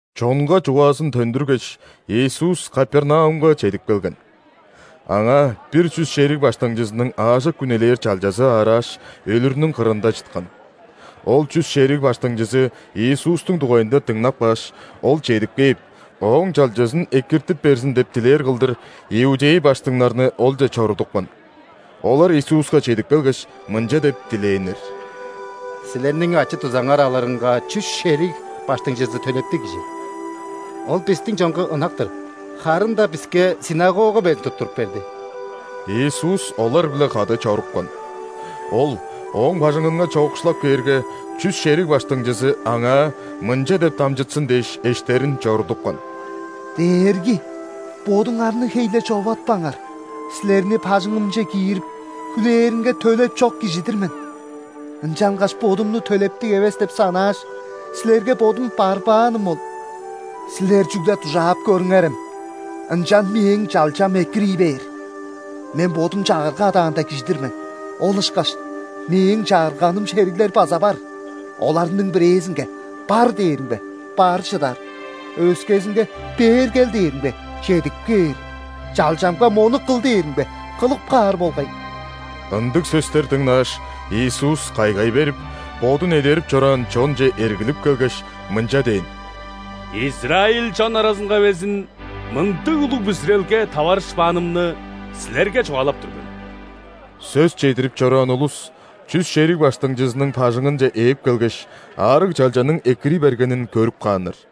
Чонга чугаазын төндүргеш, Иисус Капернаумга чедип келген. Аңаа бир чүс шериг баштыңчызының аажок үнелээр чалчазы аарааш, өлүрүнүң кырында чыткан. Ол чүс шериг баштыңчызы Иисустуң дугайында дыңнап кааш, Ол чедип кээп, ооң чалчазын экиртип берзин деп дилээр кылдыр, иудей баштыңнарны Олче чорудупкан. Олар Иисуска чедип келгеш, мынча деп дилээннер: «Силерниң ачы-дузаңар алырынга чүс шериг баштыңчызы төлептиг кижи. Ол бистиң чонга ынак-тыр, харын-даа биске ·синагога безин туттуруп берди». Иисус олар-биле кады чорупкан. Ол ооң бажыңынга чоокшулап кээрге, чүс шериг баштыңчызы Аңаа мынча деп дамчытсын дээш, эштерин чорудупкан: «Дээрги, бодуңарны хей-ле човатпаңар, Силерни бажыңымче киирип, хүлээринге төлеп чок кижи-дир мен. Ынчангаш бодумну төлептиг эвес деп санааш, Силерге бодум барбааным ол. Силер чүгле дужаап көрүңерем, ынчан мээң чалчам экирий бээр. Мен бодум чагырга адаанда кижи-дир мен, ол ышкаш мээң чагырганым шериглер база бар. Оларның бирээзинге: „Бар“ – дээримге, бар чыдар; өскезинге: „Бээр кел“ – дээримге, чедип кээр; чалчамга: „Мону кыл“ – дээримге, кылып каар болгай». Ындыг сөстер дыңнааш, Иисус кайгай берип, Бодун эдерип чораан чонче эргилип келгеш, мынча дээн: «Израиль чон аразынга безин мындыг улуг бүзүрелге таварышпаанымны силерге чугаалап тур мен». Сөс чедирип чораан улус чүс шериг баштыңчызының бажыңынче ээп келгеш, аарыг чалчаның экирий бергенин көрүп кааннар.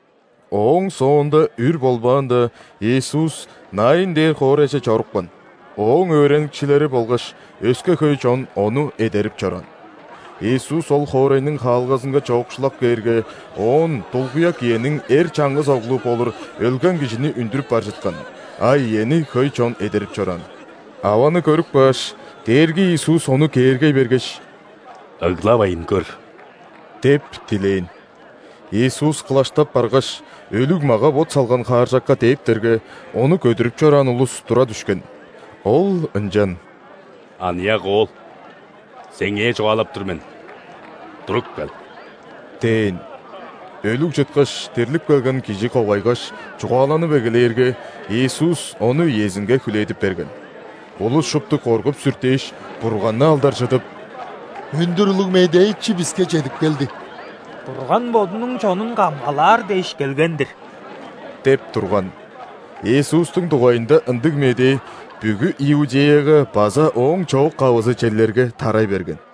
Ооң соонда үр болбаанда, Иисус Наин дээр хоорайже чорупкан. Ооң өөреникчилери болгаш өске хөй чон Ону эдерип чораан. Иисус ол хоорайның хаалгазынга чоокшулап кээрге, оон дулгуяк иениң эр чаңгыс оглу болур өлген кижини үндүрүп бар чыткан, а иени хөй чон эдерип чораан. Аваны көрүп кааш, Дээрги Иисус ону кээргей бергеш: «Ыглавайн көр» – деп дилээн. Иисус кылаштап баргаш, өлүг мага-бот салган хааржакка дээптерге, ону көдүрүп чораан улус тура дүшкен. Ол ынчан: «Аныяк оол! Сеңээ чугаалап тур мен: туруп кел!» – дээн. Өлүг чыткаш, дирлип келген кижи ковайгаш, чугааланып эгелээрге, Иисус ону иезинге хүлээдип берген. Улус шупту коргуп-сүртээш, Бурганны алдаржыдып: «Өндүр улуг медээчи биске чедип келди. Бурган Бодунуң чонун камгалаар дээш келген-дир» – деп турган. Иисустуң дугайында ындыг медээ бүгү Иудеяга база ооң чоок-кавызы черлерге тарай берген.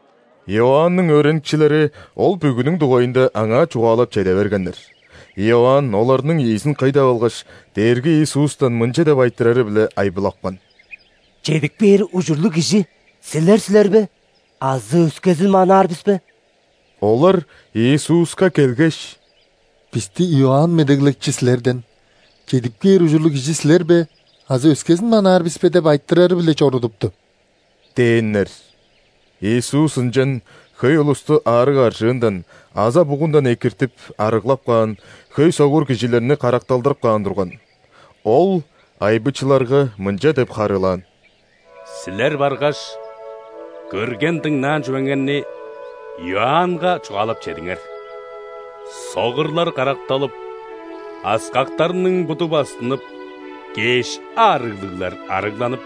Иоанның өөреникчилери ол бүгүнүң дугайында аңаа чугаалап чеде бергеннер. Иоанн оларның ийизин кый деп алгаш, Дээрги Иисустан мынча деп айтырары-биле айбылапкан: «Чедип кээр ужурлуг Кижи Силер силер бе азы өскезин манаар бис бе?» Олар Иисуска келгеш: «Бисти Иоанн Медеглекчи Силерден: „Чедип кээр ужурлуг Кижи Силер бе азы өскезин манаар бис бе?“ – деп айтырары-биле чорудупту» – дээннер. Иисус ынчан хөй улусту аарыг-аржыындан, аза-бугундан экиртип, арыглап каан, хөй согур кижилерни каракталдырып каан турган. Ол айбычыларга мынча деп харыылаан: «Силер баргаш, көрген, дыңнаан чүвеңерни Иоаннга чугаалап чедиңер: согурлар каракталып, аскактарның буду бастынып, кеш аарыглыглар арыгланып,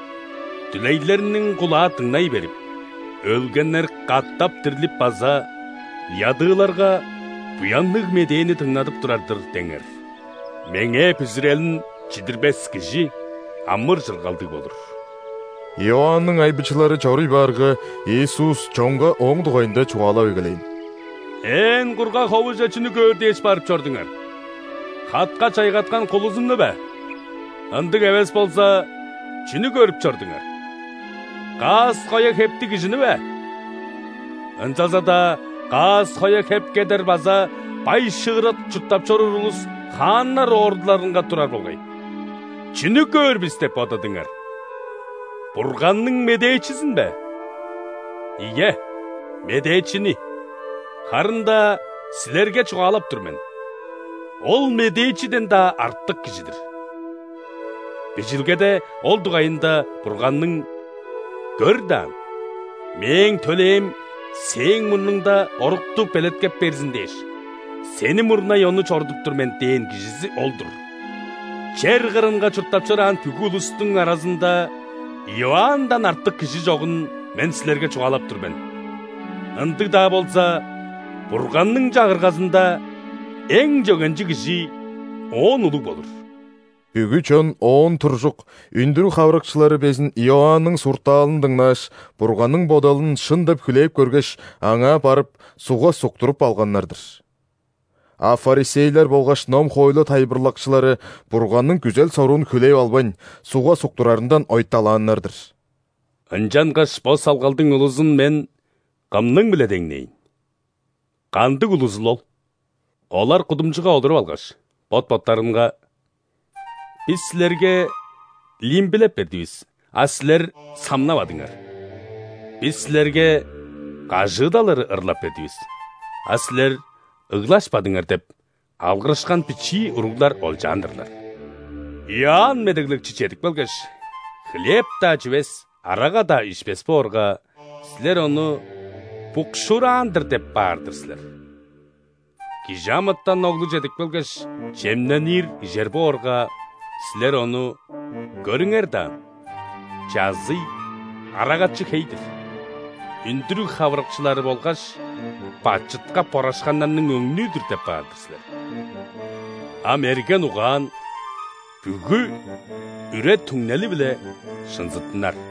дүлейлерниң кулаа дыңнай берип, өлгеннер катап дирлип база ядыыларга Буянныг Медээни дыңнадып турар-дыр деңер. Меңээ бүзүрелин чидирбес кижи амыр-чыргалдыг болур». Иоанның айбычылары чоруй баарга, Иисус чонга ооң дугайында чугаалап эгелээн: «Ээн кургаг ховуже чүнү көөр дээш барып чордуңар? Хатка чайгаткан кулузунну бе? Ындыг эвес болза, чүнү көрүп чордуңар? Каас-коя хептиг кижини бе? Ынчалза-даа каас-коя хеп кедер база бай-шыырак чурттап чоруур улус хааннар ордуларынга турар болгай. Чүнү көөр бис деп бодадыңар? Бурганның медээчизин бе? Ийе, медээчини. Харын-даа силерге чугаалап тур мен: ол – медээчиден-даа артык кижи-дир. Бижилгеде ол дугайында Бурганның: „Көр даан, Мээң төлээм Сээң мурнуңда орукту белеткеп берзин дээш, Сени мурнай ону чорудуп тур мен“ – дээн кижизи ол-дур. Чер кырынга чурттап чораан бүгү улустуң аразында Иоанндан артык кижи чогун Мен силерге чугаалап тур мен, ындыг-даа болза, Бурганның Чагыргазында эң чөгенчиг кижи оон улуг болур. Бүгү чон, оон туржук, үндүрүг хавырыкчылары безин Иоанның суртаалын дыңнааш, Бурганның бодалын шын деп хүлээп көргеш, аңаа барып, ·сугга суктуруп алганнар-дыр. А ·фарисейлер болгаш ном-хоойлу тайылбырлакчылары Бурганның күзел-соруун хүлээп албайн, сугга суктурарындан ойталааннар-дыр. Ынчангаш бо салгалдың улузун Мен кымның-биле деңнээйн? Кандыг улузул ол? Олар кудумчуга олуруп алгаш, бот-боттарынга:„Бис силерге лимбилеп бердивис,а силер самнавадыңар;бис силерге кажыыдал ыры ырлап бердивис,а силер ыглашпадыңар“ – деп алгырышкан бичии уруглар олчаан-дырлар. Иоанн Медеглекчи чедип келгеш, хлеб-даа чивес, арага-даа ишпес боорга, силер ону: „Букшуураан-дыр“ – деп баар-дыр силер. ·Кижи амытан Оглу чедип келгеш, чемненир, ижер боорга, силер Ону: „Көрүңер даан, чазый, арагачы хей-дир, үндүрүг хавырыкчылары болгаш бачытка борашканнарның өңнүү-дүр“ – деп баар-дыр силер. А мерген угаан бүгү үре-түңнели-биле шынзыттынар».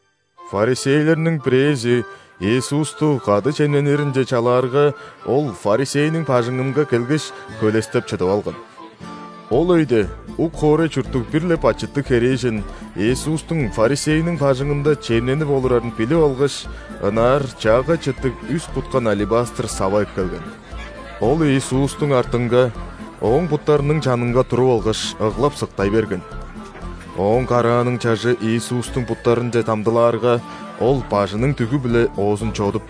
·Фарисейлерниң бирээзи Иисусту кады чемнениринче чалаарга, ол фарисейниң бажыңынга келгеш, хөлестеп чыдып алган. Ол өйде ук хоорай чурттуг бир-ле бачыттыг херээжен Иисустуң фарисейниң бажыңында чемненип олурарын билип алгаш, ынаар чаагай чыттыг үс куткан алебастр сава эккелген. Ол Иисустуң артынга, Ооң буттарының чанынга туруп алгаш, ыглап-сыктай берген. Ооң карааның чажы Иисустуң буттарынче дамдылаарга, ол бажының дүгү-биле оозун чодуп,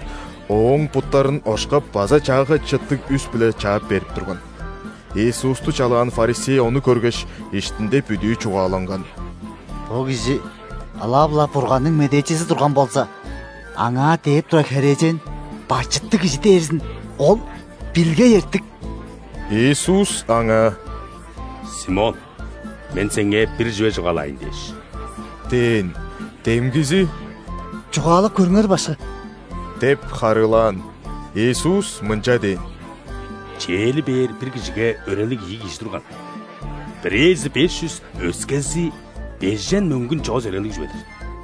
Ооң буттарын ошкап база чаагай чыттыг үс-биле чаап берип турган. Иисусту чалаан фарисей ону көргеш, иштинде бүдүү чугааланган: «Бо кижи ылап-ла Бурганның медээчизи турган болза, Аңаа дээп турар херээжен – бачыттыг кижи дээрзин Ол билгей эртик». Иисус аңаа: «Симон! Мен сеңээ бир чүве чугаалаайн дээш» – дээн. Демгизи: «Чугаалап көрүңер, Башкы» – деп харыылаан. Иисус мынча дээн: «Чээли бээр бир кижиге өрелиг ийи кижи турган: бирээзи беш чүс, өскези бежен мөңгүн чоос өрелиг чүве-дир.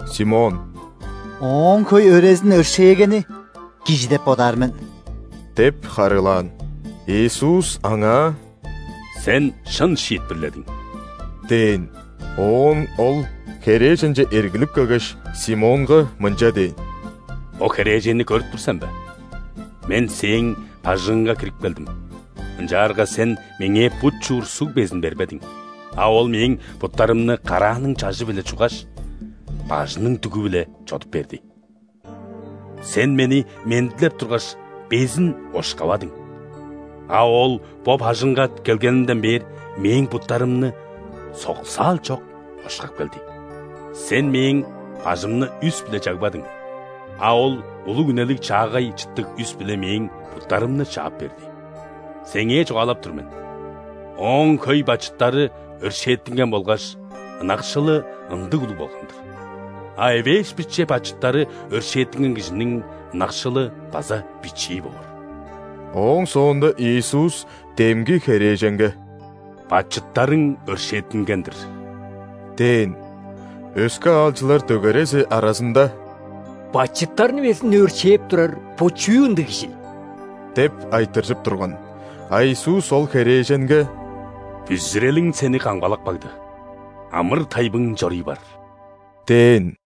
Симон: «Ооң хөй өрезин өршээгени кижи деп бодаар мен» – деп харыылаан. Иисус аңаа: «Сен шын шиитпирледиң» – дээн. Оон Ол херээженче эргилип келгеш, Симонга мынча дээн: «Бо херээженни көрүп тур сен бе? Мен сээң бажыңыңга кирип келдим, ынчаарга сен Меңээ бут чуур суг безин бербедиң, а ол Мээң буттарымны карааның чажы-биле чуггаш, бажының дүгү-биле чодуп берди. Сен Мени мендилеп тургаш, безин ошкавадың, а ол бо бажыңга келгенимден бээр, Мээң буттарымны соксаал чок ошкап келди. Сен Мээң бажымны үс-биле чагбадың, а ол улуг үнелиг чаагай чыттыг үс-биле Мээң буттарымны чаап берди. Сеңээ чугаалап тур мен: ооң хөй бачыттары өршээттинген болгаш, ынакшылы ындыг улуг болган-дыр. А эвээш-биче бачыттары өршээттинген кижиниң ынакшылы база бичии боор». Ооң соонда Иисус демги херээженге: «Бачыттарың өршээттинген-дир» – дээн. Өске аалчылар дөгерези аразында: «Бачыттарны безин өршээп турар бо чүү ындыг Кижил?» – деп айтыржып турган. А Иисус ол херээженге: «Бүзүрелиң сени камгалап кагды, амыр-тайбың чору�� бар» – дээн.